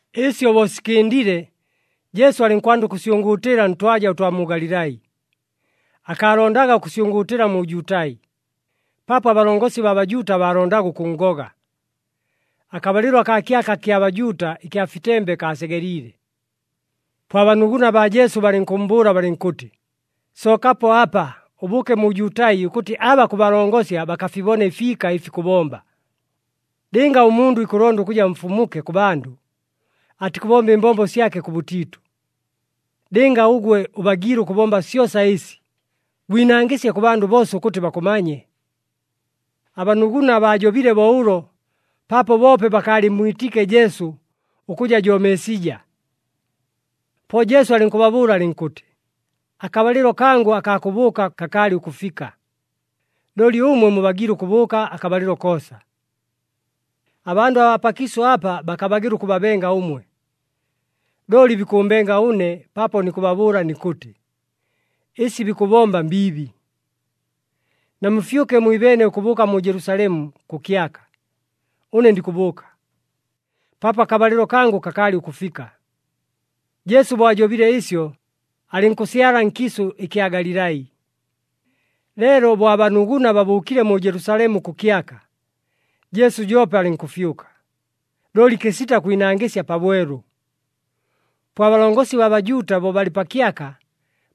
Ɨsyo bo sikɨndile, Jesu alɨnkwanda ʉkʉsyʉngʉʉtɨla ntwaja ʉtwa mu Galilai. Akaalondaga ʉkʉsyʉngʉʉtɨla mu Jutai, paapo abalongosi baa Bajuuta baalondaga ʉkʉnngoga. Akabalɨlo akaa kyaka kya Bajuuta ɨkya fitembe kaasegeliile. Po abanuguna baa Jesu balɨnkʉmmbʉʉla balɨnkʉtɨ, “Sookapo apa, ʉbʉʉke mu Jutai ʉkʉtɨ aba kʉbalongosya bakafibone ɨfiika ɨfi kʉbomba. Lɨnga ʉmundʉ ikʉlonda ʉkʉja mfumuke kʉ bandʉ, atikʉbomba ɨmbombo syake kʉbʉtiitʉ. Lɨnga ʉgwe ʉbagiile ʉkʉbomba syosa ɨsi, gwinangɨsye kʉ bandʉ boosa ʉkʉtɨ bakʉmanye.” Abanuguna baajobile bo ʉlo paapo boope bakaalɨmmwitiike Jesu ʉkʉja jo Meesija. Po Jesu alɨnkʉbabʉʉla alɨnkʉtɨ, “Akabalɨlo kangʉ akaa kʉbʉʉka kakaalɨ ʉkʉfika, looli ʉmwe mubagiile ʉkʉbʉʉka akabalɨlo koosa. Abandʉ abaa pakiisʉ apa bakabagɨla ʉkʉbabenga ʉmwe, looli bikʉʉmbenga ʉne paapo nikʉbabʉʉla nikʉtɨ, ɨsi bikʉbomba mbiibi. Namufyʉke mwibeene ʉkʉbʉʉka mu Jelusalemu kʉ kyaka. Ʉne ndikʉbʉʉka, paapo akabalɨlo kangʉ kakaalɨ ʉkʉfika.” Jesu bo ajobile ɨsyo, alɨnkʉsyala nkiisʉ ɨkya Galilai. Leelo bo abanuguna babʉʉkile mu Jelusalemu kʉ kyaka, Jesu joope alɨnkʉfyʉka, looli kɨsita kwinangɨsya pabwelu. Po abalongosi baa Bajuuta, bo balɨ pa kyaka,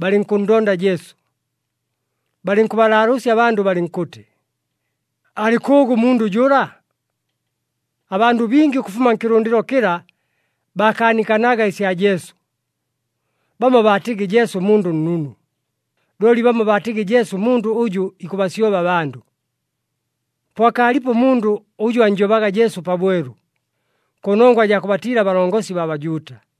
balɨnkʉnndonda Jesu. Balɨnkʉbalaalʉʉsya abandʉ balɨnkʉtɨ, “Alɨ kʉʉgʉ ʉmundʉ jʉla?” Abandʉ bingi ʉkʉfuma nkɨlʉndɨlo kɨla, baakaanikanaga ɨsya Jesu. Bamo baatɨgɨ Jesu mundʉ nnunu, looli bamo baatɨgɨ Jesu mundʉ ʉjʉ ikʉbasyoba abandʉ. Po akaalipo ʉmundʉ ʉjʉ annjobaga Jesu pabwelu, kʉnongwa jaa kʉbatiila abalongosi baa Bajuuta.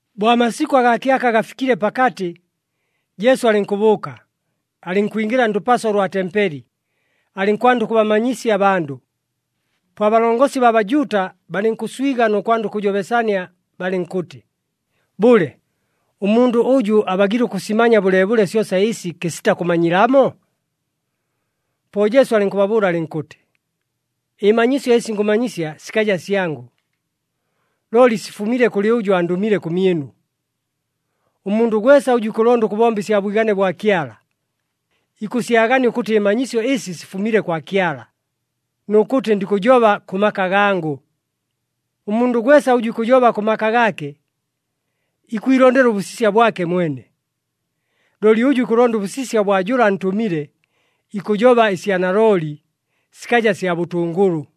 Bo amasikʉ agaa kyaka gafikile pakatɨ, Jesu alɨnkʉbʉʉka, alɨnkwingɨla ndʉpaso ʉlwa tempeli, alɨnkwanda ʉkʉbamanyisya abandʉ. Po abalongosi baa Bajuuta balɨnkʉswiga nʉ kwanda ʉkʉjobesania balɨnkʉtɨ, “Bʉle, ʉmundʉ ʉjʉ abagiile ʉkʉsimanya bʉleebʉle syosa ɨsi kɨsita kʉmanyilamo?” Po Jesu alɨnkʉbabʉʉla alɨnkʉtɨ, “Ɨmanyisyo ɨsi ngʉmanyisya sikaja syangʉ, looli sifumile kʉlɨ ʉjʉ andʉmile kʉmyɨnu. Ʉmundʉ gwesa ʉjʉ ikʉlonda ʉkʉbomba ɨsya bwigane bwa Kyala, ikʉsyagania ʉkʉtɨ ɨmanyisyo ɨsi sifumile kwa Kyala, nʉ kʉtɨ ndikʉjoba kʉ maka gangʉ. Ʉmundʉ gwesa ʉjʉ ikʉjoba kʉ maka gaake, ikwilondela ʉbʉsisya bwake mwene. Looli ʉjʉ ikʉlonda ʉbʉsisya ʉbwa jʉla antʉmile, ikʉjoba ɨsya nalooli, sikaja sya bʉtʉngʉlʉ.”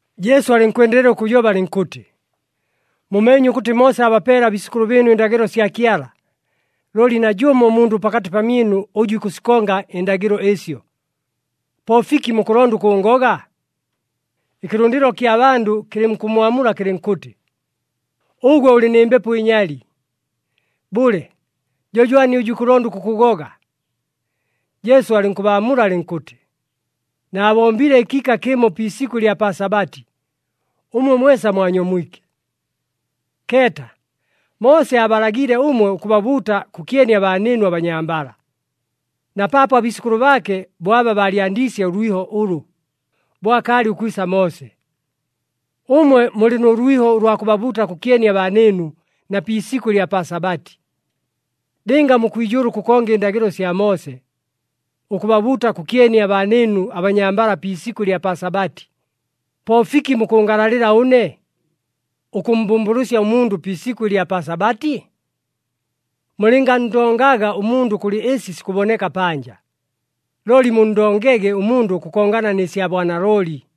Jesu alɨnkwendelela ʉkʉjoba alɨnkʉtɨ, “Mumeenye ʉkʉtɨ Moose aabapeele abiisʉkʉlʉ bɨɨnu ɨndagɨlo sya Kyala. Looli najʉmo ʉmundʉ pakatɨ pamyɨnu ʉjʉ ikʉsikonga ɨndagɨlo ɨsyo. Po fiki mukʉlonda ʉkʉʉngoga?” Ɨkɨlʉndɨlo ɨkya bandʉ kɨlɨnkʉmmwamula kɨlɨnkʉtɨ, “Ʉgwe ʉlɨ nɨ mbepo ɨnyali! Bʉle, jo jwani ʉjʉ ikʉlonda ʉkʉkʉgoga?” Jesu alɨnkʉbaamula alɨnkʉtɨ, “Naabombile ɨkiika kɨmo pi isikʉ ɨlya pa Sabati, ʉmwe mwesa mwanyomwike. Keeta, Moose aabalagiile ʉmwe ʉkʉbabuuta kʉkyeni abaanɨɨnu abanyambala, na paapo abiisʉkʉlʉ baake bo aba baalyandiisye ʉlwiho ʉlʉ, bo akaalɨ ʉkwisa Moose. Ʉmwe mulɨ nʉ lwiho ʉlwa kʉbabuuta kʉkyeni abaanɨɨnu na pi isikʉ ɨlya pa Sabati. Lɨnga mukwijʉʉla ʉkʉkonga ɨndagɨlo sya Moose, ʉkʉbabuuta kʉkyeni abaanɨɨnu abanyambala pi isikʉ ɨlya pa Sabati, po fiki mukʉngalalɨla ʉne, ʉkʉmmbʉmbʉlʉsya ʉmundʉ pi isikʉ ɨlya pa Sabati? Mulɨnganndongaga ʉmundʉ kʉlɨ ɨsi sikʉboneka panja, looli munndongege ʉmundʉ ʉkʉkongana nɨ sya bwanalooli.”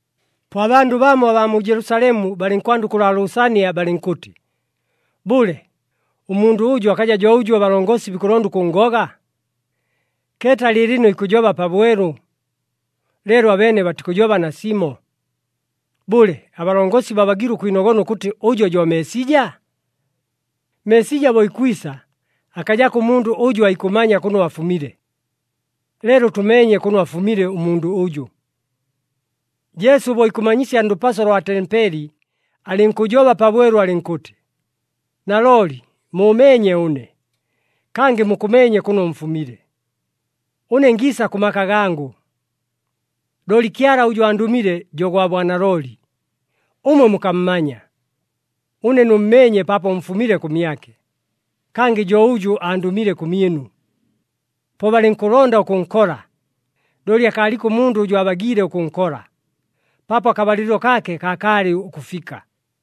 Po abandʉ bamo abaa mu Jelusalemu balɨnkwanda ʉkʉlaalʉʉsania balɨnkʉtɨ, “Bʉle, ʉmundʉ ʉjʉ akaja jo ʉjʉ abalongosi bikʉlonda ʉkʉnngoga? Keeta lɨɨlɨno ikʉjoba pabwelu, leelo abeene batikʉjoba nasimo! Bʉle, abalongosi babagiile ʉkwinogona ʉkʉtɨ ʉjo jo Meesija? Meesija bo ikwisa akajako ʉmundʉ ʉjʉ aikʉmanya kʉno afumile, leelo tʉmeenye kʉno afumile ʉmundʉ ʉjʉ!” Jesu bo ikʉmanyisya ndʉpaso lwa tempeli, alɨnkʉjoba pabwelu alɨnkʉtɨ, “Nalooli muumeenye ʉne, kangɨ mukʉmeenye kʉno mfumile. Ʉne ngiisa kʉ maka gangʉ! Looli Kyala ʉjʉ andʉmile jo gwa bwanalooli. Ʉmwe mukammanya. Ʉne nʉmmeenye paapo mfumile kʉmyake, kangɨ jo ʉjʉ andʉmile kʉmyɨnu.” Po balɨnkʉlonda ʉkʉnkola, looli akaaliko ʉmundʉ ʉjʉ aabagiile ʉkʉnkola, paapo akabalɨlo kaake kakaalɨ ʉkʉfika.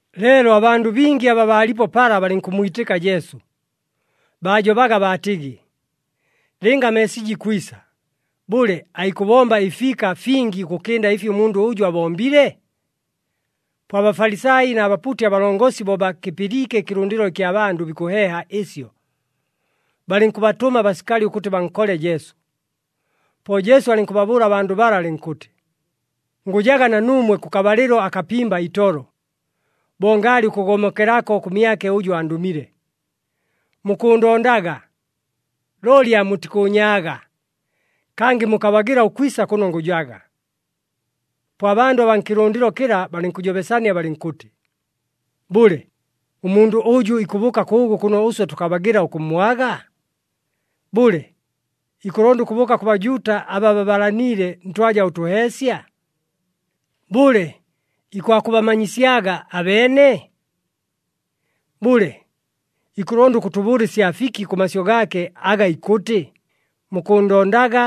Leelo abandʉ bingi aba baalipo pala balɨnkʉmmwitɨka Jesu. Baajobaga baatɨgɨ, “Lɨnga Meesija ikwisa, bʉle, aikʉbomba ɨfiika fingi ʉkʉkɨnda ɨfi ʉmundʉ ʉjʉ abombile?” Po aBafalisai na bapuuti abalongosi bo bakɨpɨliike ɨkɨlʉndɨlo ɨkya bandʉ bikʉheeha ɨsyo, balɨnkʉbatʉma abasikali ʉkʉtɨ bankole Jesu. Po Jesu alɨnkʉbabʉʉla abandʉ bala alɨnkʉtɨ, “Ngʉjaga na nuumwe kʉkabalɨlo akapimba itolo, bo ngaalɨ ʉkʉgomokelako kʉmyake ʉjʉ andʉmile. Mukʉʉndondaga, looli aamutikʉʉnyaaga, kangɨ mukabagɨla ʉkwisa kʉno ngʉjaga.” Po abandʉ abaa nkɨlʉndɨlo kɨla balɨnkʉjobesania balɨnkʉtɨ, “Bʉle, ʉmundʉ ʉjʉ ikʉbʉʉka kʉʉgʉ kʉno ʉswe tʉkabagɨla ʉkʉmmwaga? Bʉle, ikʉlonda ʉkʉbʉʉka kʉ Bajuuta aba babalaniile ntwaja ʉtʉheesya? Bʉle, ikwakʉbamanyisyaga abeene? Bʉle, ikʉlonda ʉkʉtʉbʉʉla ɨsya fiki kʉ masyʉ gaake aga ikʉtɨ, ‘Mukʉʉndondaga,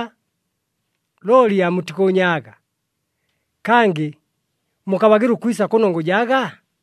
looli aamutikʉʉnyaaga, kangɨ mukabagɨla ʉkwisa kʉno ngʉjaga’?”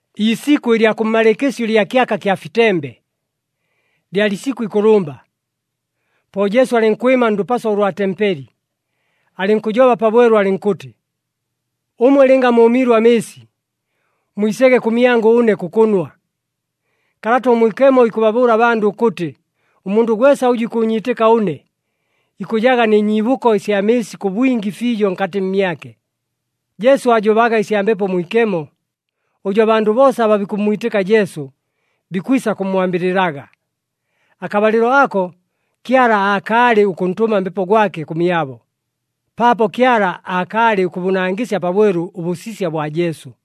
Iisikʉ ɨlya kʉmmalɨɨkɨsyo ɨlya kyaka kya fitembe, lyalɨ isikʉ ikʉlʉmba. Po Jesu alɨnkwɨma ndʉpaso ʉlwa tempeli, alɨnkʉjoba pabwelu alɨnkʉtɨ, “Ʉmwe lɨnga mʉʉmiilwe amɨɨsi, mwisege kʉmyangʉ ʉne kʉkʉnwa. Kalata ʉMwikemo ikʉbabʉʉla abandʉ ʉkʉtɨ ʉmundʉ gwesa ʉjʉ ikʉʉnyiitɨka ʉne, ikʉjaga nɨ nyiibʉko ɨsya mɨɨsi kʉ bwingi fiijo nkatɨ mmyake.” Jesu aajobaga ɨsya Mbepo Mwikemo, ʉjʉ abandʉ boosa aba bikʉmmwitɨka Jesu, bikwisa kʉmmwambɨlɨlaga. Akabalɨlo ako, Kyala aakaalɨ ʉkʉntʉma Mbepo gwake kʉmyabo, paapo Kyala aakaalɨ ʉkʉbʉnangɨsya pabwelu ʉbʉsisya bwa Jesu.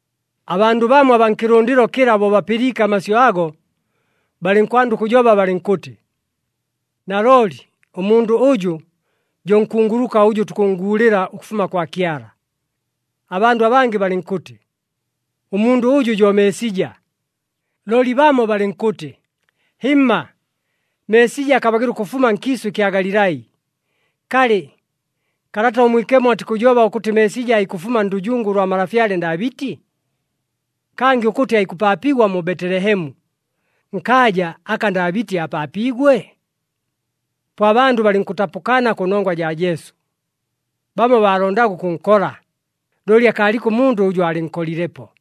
Abandʉ bamo abaa nkɨlʉndɨlo kɨla bo bapɨliike amasyʉ ago, balɨnkwanda ʉkʉjoba balɨnkʉtɨ, “Nalooli ʉmundʉ ʉjʉ, jo nkunguluka ʉjʉ tukʉnnguulɨla ʉkʉfuma kwa Kyala.” Abandʉ abangɨ balɨnkʉtɨ, “Ʉmundʉ ʉjʉ jo Meesija.” Looli bamo balɨnkʉtɨ, “Hɨmma, Meesija akabagɨla ʉkʉfuma nkiisʉ ɨkya Galilai. Kalɨ, Kalata ʉMwikemo atikʉjoba ʉkʉtɨ Meesija aikʉfuma ndʉjungu ʉlwa malafyale Ndaabɨti? Kangɨ ʉkʉtɨ aikʉpaapigwa mu Betelehemu, nkaaja aka Ndaabɨti aapaapiigwe?” Po abandʉ balɨnkʉtapʉkana kʉnongwa jaa Jesu. Bamo baalondaga ʉkʉnkola, looli akaaliko ʉmundʉ ʉjʉ aalɨnkolilepo.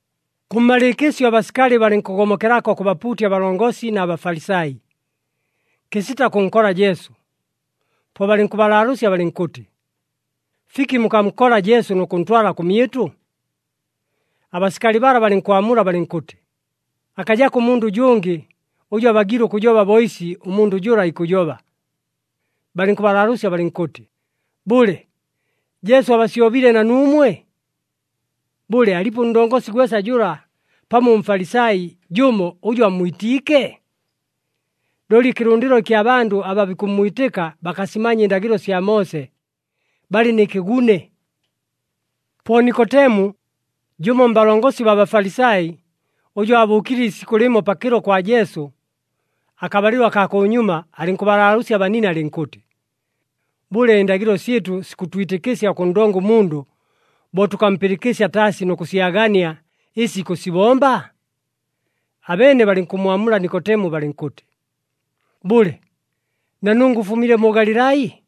Kʉmmalɨɨkɨsyo abasikali balɨnkʉgomokelako kʉ bapuuti abalongosi na Bafalisai, kɨsita kʉnkola Jesu. Po balɨnkʉbalaalʉʉsya balɨnkʉtɨ, “Fiki mukankola Jesu nʉ kʉntwala kʉmyɨtʉ?” Abasikali bala balɨnkwamula balɨnkʉtɨ, “Akajako ʉmundʉ ʉjʉngɨ ʉjʉ abagiile ʉkʉjoba bo ɨsi ʉmundʉ jʉla ikʉjoba.” Balɨnkʉbalaalʉʉsya balɨnkʉtɨ, “Bʉle, Jesu abasyobile na nuumwe? Bʉle, alipo ʉndongosi gwesa jʉla pamo ʉMfalisai jʉmo ʉjʉ ammwitiike? Looli ɨkɨlʉndɨlo ɨkya bandʉ aba bikʉmmwitɨka bakasimanya ɨndagɨlo sya Moose. Balɨ nɨ kɨgune.” Po Nikotemu, jʉmo mbalongosi baa Bafalisai, ʉjʉ aabʉʉkile iisikʉ lɨmo pakɨlo kwa Jesu, akabalɨlo akaa kʉnyuma, alɨnkʉbalaalʉʉsya abanine alɨnkʉtɨ, “Bʉle, ɨndagɨlo syɨtʉ sikʉtwitɨkɨsya ʉkʉnndonga ʉmundʉ bo tʉkampɨlɨkɨsya taasi nʉ kʉsyagania ɨsi ikʉsibomba?” Abeene balɨnkʉmmwamula Nikotemu balɨnkʉtɨ, “Bʉle, na nungwe ʉfumile mu Galilai?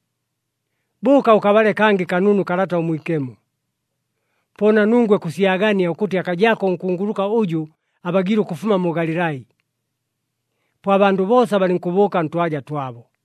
Bʉʉka ʉkabale kangɨ kanunu Kalata ʉMwikemo, po na nungwe kʉsyagania ʉkʉtɨ akajako ʉnkunguluka ʉjʉ abagiile ʉkʉfuma mu Galilai.” [ Po abandʉ boosa balɨnkʉbʉʉka ntwaja twabo.